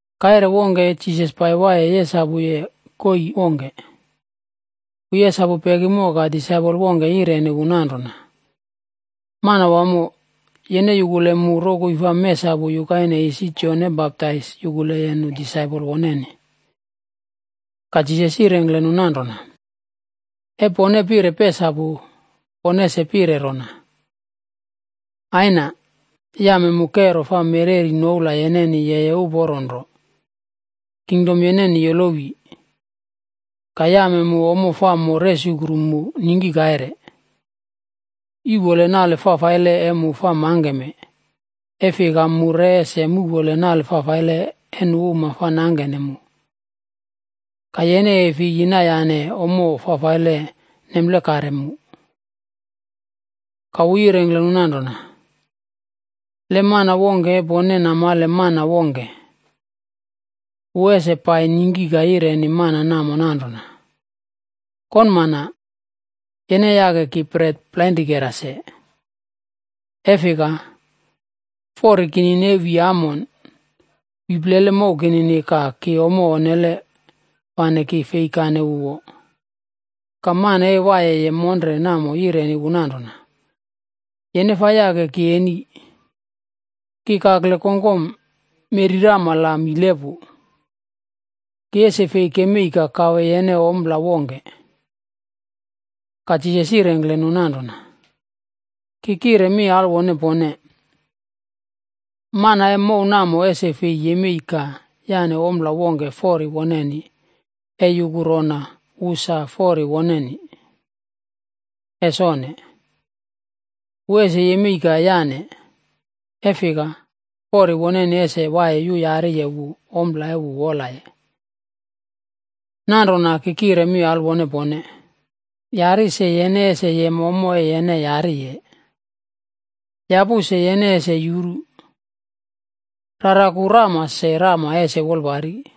Kaire wongke Jisas pai waiye yesapuye koii wongke, wu yesapu pekimo ka disaipol wongke yireni wu nanrona, “Manawamo, yene yukule mu rokoi fa mesapu yukaine isi Jon e Baptais yukuleye nu disaipol woneni.” Ka Jisas yirengkle nu nanrona, “E pone pire pesapu, pone es pire rona: ‘Aina, yame mu kero fa mereri noula yeneni yeye holi. Kingdom yeneni yolowi. Ka yame mu ommo fa mo resukru mu, ningki kaire. Yuꞌpole nale fafaile e mu fa mangkeme, e fika, mu re ese muꞌpole nale fafaile e nu uma fa nangkene mu. Ka yene e fi yinayane ommo fafaile nemplekare mu.’” Ka wu yirengkle nu nanrona, “Le mana wongke e pone namale mana wongke, wu ese pai ningki ka yireni mana namo nanrona, ‘Konmana, yene yake ki bret plainrikera se. E fika, fori kinini e wi amon, wi plele mow kinini ka ki ommo onnele fane ki fei kane wu wo.’ “Ka mana e waiye monre namo yireni wu nanrona, ‘Yene fa yake ki eni, ki kakle kongkom meꞌri rama la mile pu. Ki ese fei kemei ka kawe yene ompla wongke.’” Ka Jisas yirengkle nu nanrona, “Ki kire mi alwone pone, mana e mow namo ese fei yemei ka yaꞌne ompla wongke fori woneni e yuku rona wu sa fori wunini. Es onne! Wu ese yemei ka yane, e fika fori woneni ese waiye yuyariye wu ompla e wu wolaye. “Nanrona ki kire mi alwone pone, yari se yene ese yem ommo e yene yariye; yapu se yene ese yuru; raraku rama se rama ese wolpari.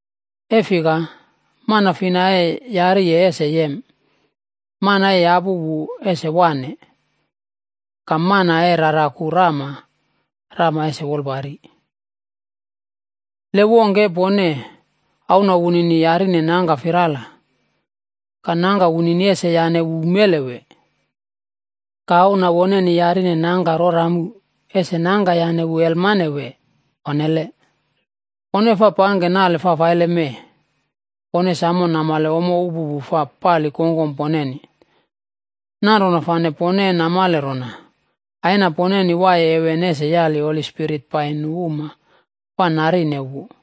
E fika mana fina e yariye ese yem; mana e yapu wu ese waꞌne; ka mana e raraku rama, rama ese wolpari. “Le wongke e pone, auna wunini yarine nangka firala ka nangka wunini ese yaꞌne wu umele wee? Ka auna woneni yarine nangka rora amu, ese nangka yaꞌne wu aiyakrowale wee? Onnele. Pone fa pangke nale fafaile mee, pone samo namale ommo upupu fa pali kongkom poneni. Nanrona fane pone e namale rona Aina poneni waiye heven ese yali Holi Spirit pai nu uma fa narinene wu!”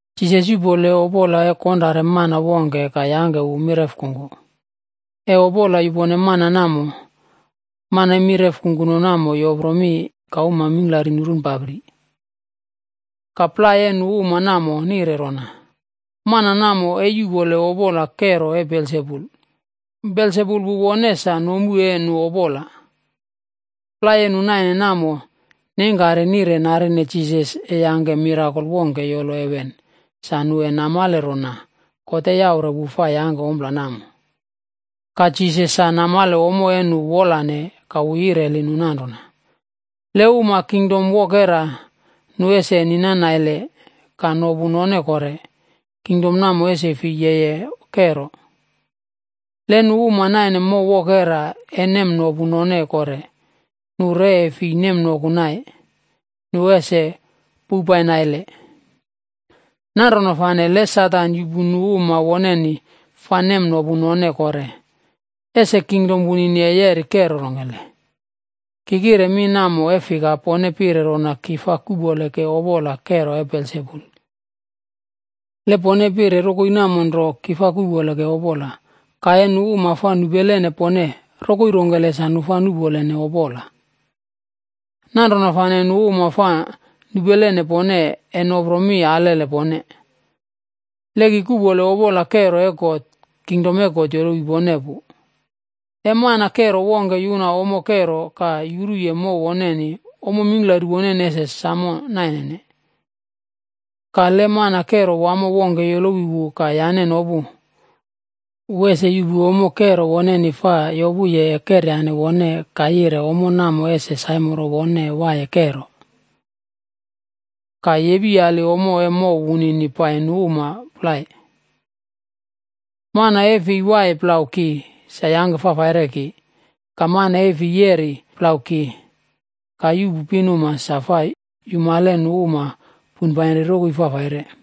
Jisas yuꞌpole opola e konrare mana wongke ka yangke wu mireꞌf kungku. E opola yupone mana namo, man e mireꞌf kungku namo yopro mi ka uma mingklari nurunpapri. Ka plai e nu uma namo nire rona, “Mana namo e yuꞌpole opola kero e Belsebul. Belsebul wu wone sa nomu e nu opola.” Plai e nu naine namo neingkari nire narine Jisas e yangke mirakol wongke yolo heven sa nu e namale rona God e yaure wu fa yangke ompla namo. Ka Jisas sa namale ommo e nu wolane ka wu yireli nu nanrona, “Le uma e Kingdom wokera nu ese ninan naile ka nopu none kore, kingdom namo ese fi yeye kero. Le nu uma e naine mow wokera e nemnopu none kore, nu re e fi nemnoku nai, nu ese poupai naile. Nanrona fane, le Satan yuꞌpu nu uma woneni fa nemnopune none kore, ese kingdom wunini e yeri kero rongkele? Ki kire mi namo e fika, pone pire rona ki fa kuꞌpole ke opola kero e Belsebul. Le pone pire rokoi namo nro, ki fa kuꞌpole ke opola ka e nu uma fa nupele pone, rokoi rongkele sa nu fa nuꞌpolene opola? Nanrona fane, nu uma fa nupelene pone e nopro mi alele pone. Le ki kuꞌpole opola kero e God, Kingdom e God yolowi pone pu. “Le mana kero wongke yuna ommo kero ka yuruye mow woneni, ommo mingklari woneni ese samo nainene. Ka le mana kero wamo wongke yolowi wu ka yane nopu, wu ese yuꞌpu ommo kero woneni fa yopuye e keryane wone ka yire ommo namo ese saimoro wone e waiye kero. Ka yepiyali ommo e mow wunini pai nu uma plai. “Mana e fei waiye plau ki sa yangke fafaire ki ka mana e fi yeri plau ki ka yuꞌpu pinuma sa fa yumale nu uma poinpainri rokoi fafaire.”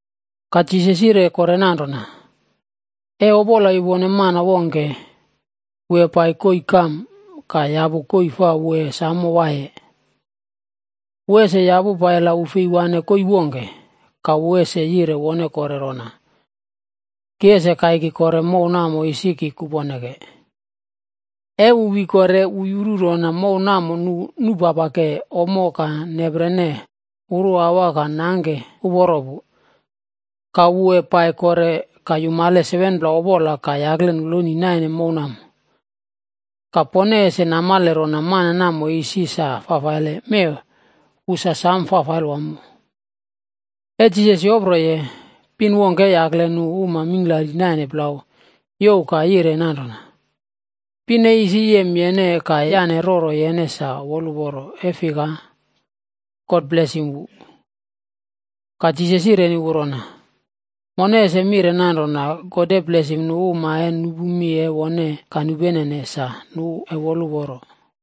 Ka Jisas yire kore nanrona, “E opola yupone mana wongke, wu e pai koii kam ka yapu koii fa wu e samo waiye. Wu ese yapu pai la wu fei waꞌne koii wongke ka wu ese yire wone kore rona, ‘Ki ese kaiki kore mow namo isi ki kuponeke.’ E wu wi kore, wu yuru rona mow namo nu nupapake ommo ka neprene uruawa ka nangke uporo pu. Ka wu e pai kore ka yumale 7pla opola ka yakle noloni naine mow namo. Ka pone ese namale rona mana namo isi sa fafaile, mee wu sa sam fafaile wamo.” E Jisas yoproye, pin wongke e yakle nu uma mingklari naine plau youw ka yire nanrona, “Pin e isi yem yene ka yane roro yene sa woluporo, e fika God blesim wu.” Ka Jisas yireni wu rona, “Mone ese mire nanrona, God e blesim nu uma e nupu mi e wone ka nupenene sa nu e woluporo.”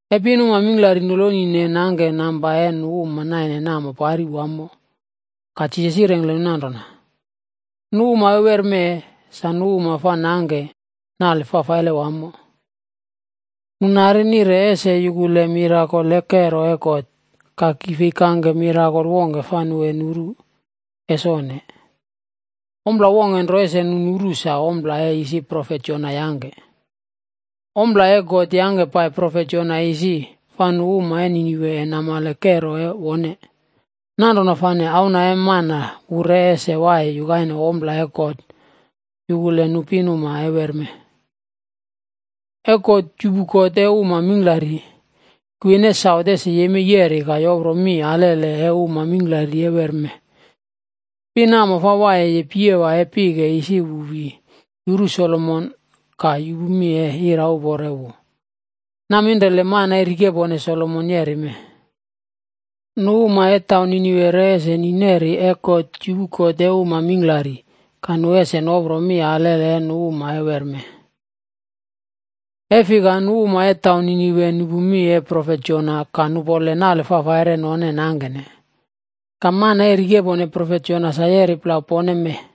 E pinuma mingklari nolonine nangke namba e nu uma naine namo pari wamo ka Jisas yirengkle nu nanrona, “Nu uma e wermee, sa nu uma fa nangke nale fafaile wamo. Nu nari nire ese yukule mirakol e kero e God. Ka ki fei kangke mirakol wongke fa nu e nuru. Es onne! Ompla wongke nro ese nu nuru, sa ompla e isi profet Jona yangke. Ompla e God yangke pai profet Jona isi, fa nu uma e Ninive e namale kero e wone. Nanrona fane, Auna e Mana wu re ese waiye yukaine ompla e God yukule nu pinuma e wermee. E God yupu kot e uma mingklari, Kwin e Saut ese yemei yeri ka yopro mi alele e uma mingklari e wermee. Pin namo fa waiyeye piyewa e pike isi wu wi yuru Solomon ka yupu mi e irauporo e wu. Naminrele mana e rikepone Solomon yeri mee. Nu uma e taun Ninive re ese ni neri e God yupu kot e uma mingklari, ka nu ese nopro mi alele e nu uma e wermee. E fika nu uma e taun Ninive nupu mi e profet Jona ka nu bilipim ka nupole nale fafaire e none nangkene. Ka mana e rikepone profet Jona sa yeri plau pone mee.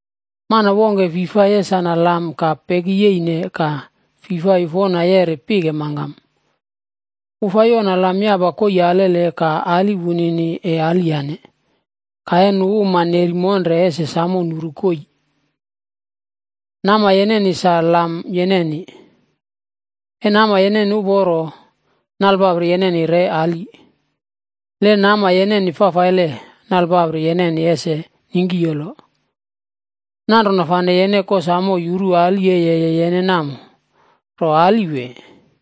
“Mana wongke fi fa yesana lam ka pekiyeine ka fi fa yufona yeri pike mangkam. Wu fa yona lam yapa koii alele ka ali wunini e aliyane. Ka e nu uma neri monre ese samo nuru koii. Nama yeneni sa lam yeneni. E nama yeneni uporo, nalepapri yeneni re ali. Le nama yeneni fafaile, nalepapri yeneni ese ningkiyolo. Nanrona fane yene kosamo yuru ali e yeye yene namo, ro ali wee?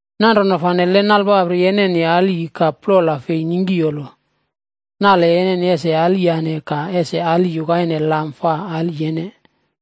Nanrona fane, le nalpapri yeneni ali ka plola fei ningkiyolo, nale yeneni ese aliyane ka ese ali yukaine lam fa ali yene.”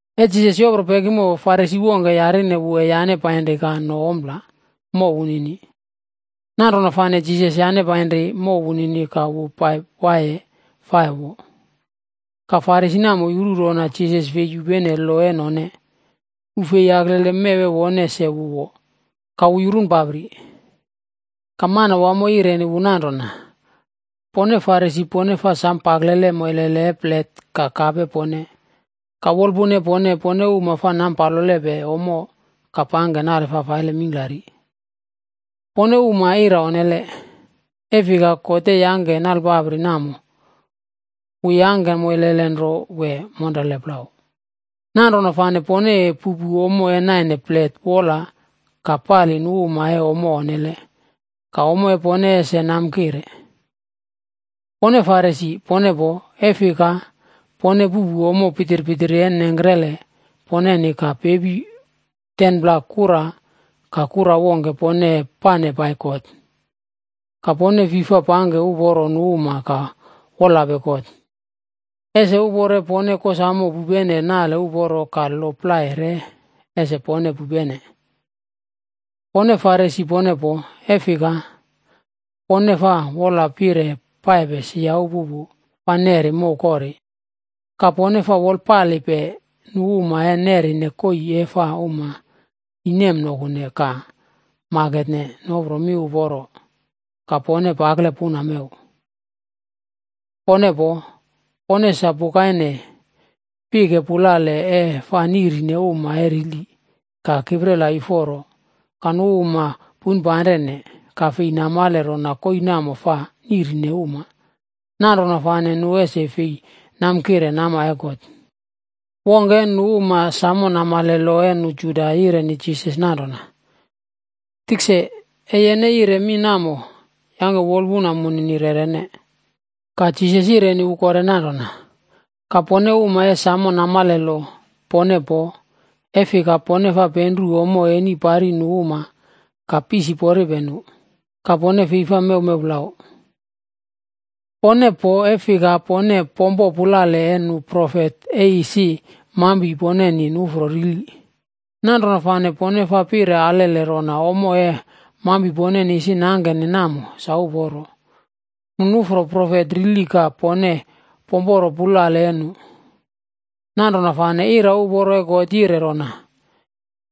E Jisas yopro pekimo, Farisi wongke yarine wu e yane painri ka no ompla mow wunini. Nanrona fane Jisas yane painri mow wunini ka wu pai waiye fa e wo. Ka Farisi namo yuru rona Jisas fei yupene lo e none, wu fei yaklele mew e wone se wu wo, ka wu yurunpapri. Ka Manawamo yireni wu nanrona, “Pone Farisi pone fa sam paklele moilele e plet ka kap e pone, ka wolpuna e pone, pone uma fa nampalope ommo ka pangke nale fafaile mingklari. Pone uma ira onnele! E fika God e yangke nalepapri namo, wu yangke moilele nro wee monrele plau? Nanrona fane pone e puꞌpu ommo e naine plet wola ka pali nu uma e ommo onnele, ka ommo e pone ese namkire. “Pone Farisi, pone poo, e fika pone puꞌpu ommo pitpitiri e nengkrele poneni ka pepi 10pla kura ka kura wongke pone e pane pai God. Ka pone fi fa wolpale nu uma ka wolape God. Ese uporo e pone kosamo pupene nale uporo ka lo plai re ese pone pupene. “Pone Farisi pone poo, e fika pone fa wola pire paipe sia upupu fa nerine mow kori, ka pone fa wolpalepe nu uma e nerine koii e fa uma ni nemnokune ka maketne nopro mi uporo ka pone pakle puna mew. “Pone poo, pone sa pukaine pike pulale e fa niꞌrine uma e rili ka kiprela yuforo ka nu uma poinpanrene ka fei namale rona koii namo fa niꞌrine uma, nanrona fane nu ese fei namkire nama e God.” Wongke e nu uma samo namale lo e nu Juda yireni Jisas nanrona, “Tikse, e yene yire mi namo, yangke wolpuna munini rerene.” Ka Jisas yireni wu kore nanrona, “Ka pone uma e samo namale lo, pone poo, e fika pone fa penru ommo eni pari nu uma ka pisiporipe nu. Ka pone fei fa mewmew plau. “Pone poo, e fika pone pompope pulale e nu profet e isi mampi poneni nuꞌfro rili. Nanrona fane pone fa pire alele rona ommo e mampi poneni isi nangkene namo sa uporo. Nu nuꞌfro profet rili ka pone pomporo pulale e nu. Nanrona fane irauporo e God yire rona,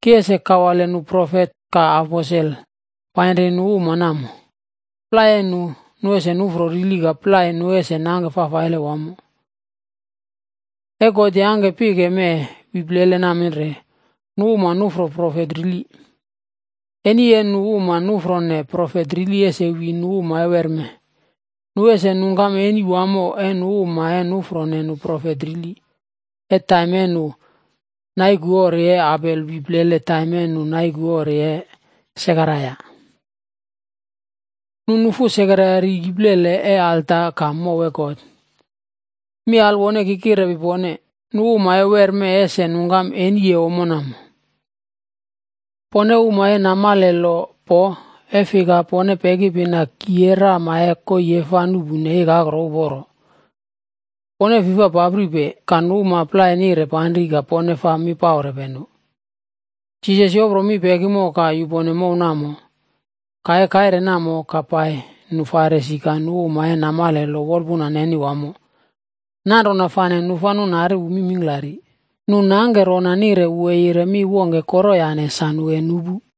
‘Ki ese kawale nu profet ka aposel painri nu uma namo. Plai e nu, nu ese nuꞌfro rili ka plai nu ese nangke fafaile wamo.’ E God yangke pike mee wi plele naminre, nu uma nuꞌfro profet rili. Eni e nu uma nuꞌfrone profet rili ese wi nu uma e wermee. Nu ese nungkam eni wamo e nu uma e nuꞌfrone nu profet rili, e taim e nu naiku ori e Abel wi plele taim e nu naiku ori e Sekaraia. Nu nufu Sekaraia ri iplele e alta ka mow e God. Mi alwone, ki kirepi pone, nu uma e wermee ese nungkam eni e ommo namo. “Pone uma e namale lo poo, e fika pone pekipina kii e rama e koii e fa nuꞌpune ikakro uporo. Pone fi fa papripe, ka nu uma plai nire panri ka pone fa mi paurepe nu.” Jisas yopro mi pekimo ka yupone mow namo. Ka e kaire namo ka pai nu Farisi ka nu uma e namale lo wolpuna neni wamo, nanrona fane nu fa nunari wu mi mingklari. Nu nangke rona nire nupu wu e yire mi wongke koroyane sa nu e nupu.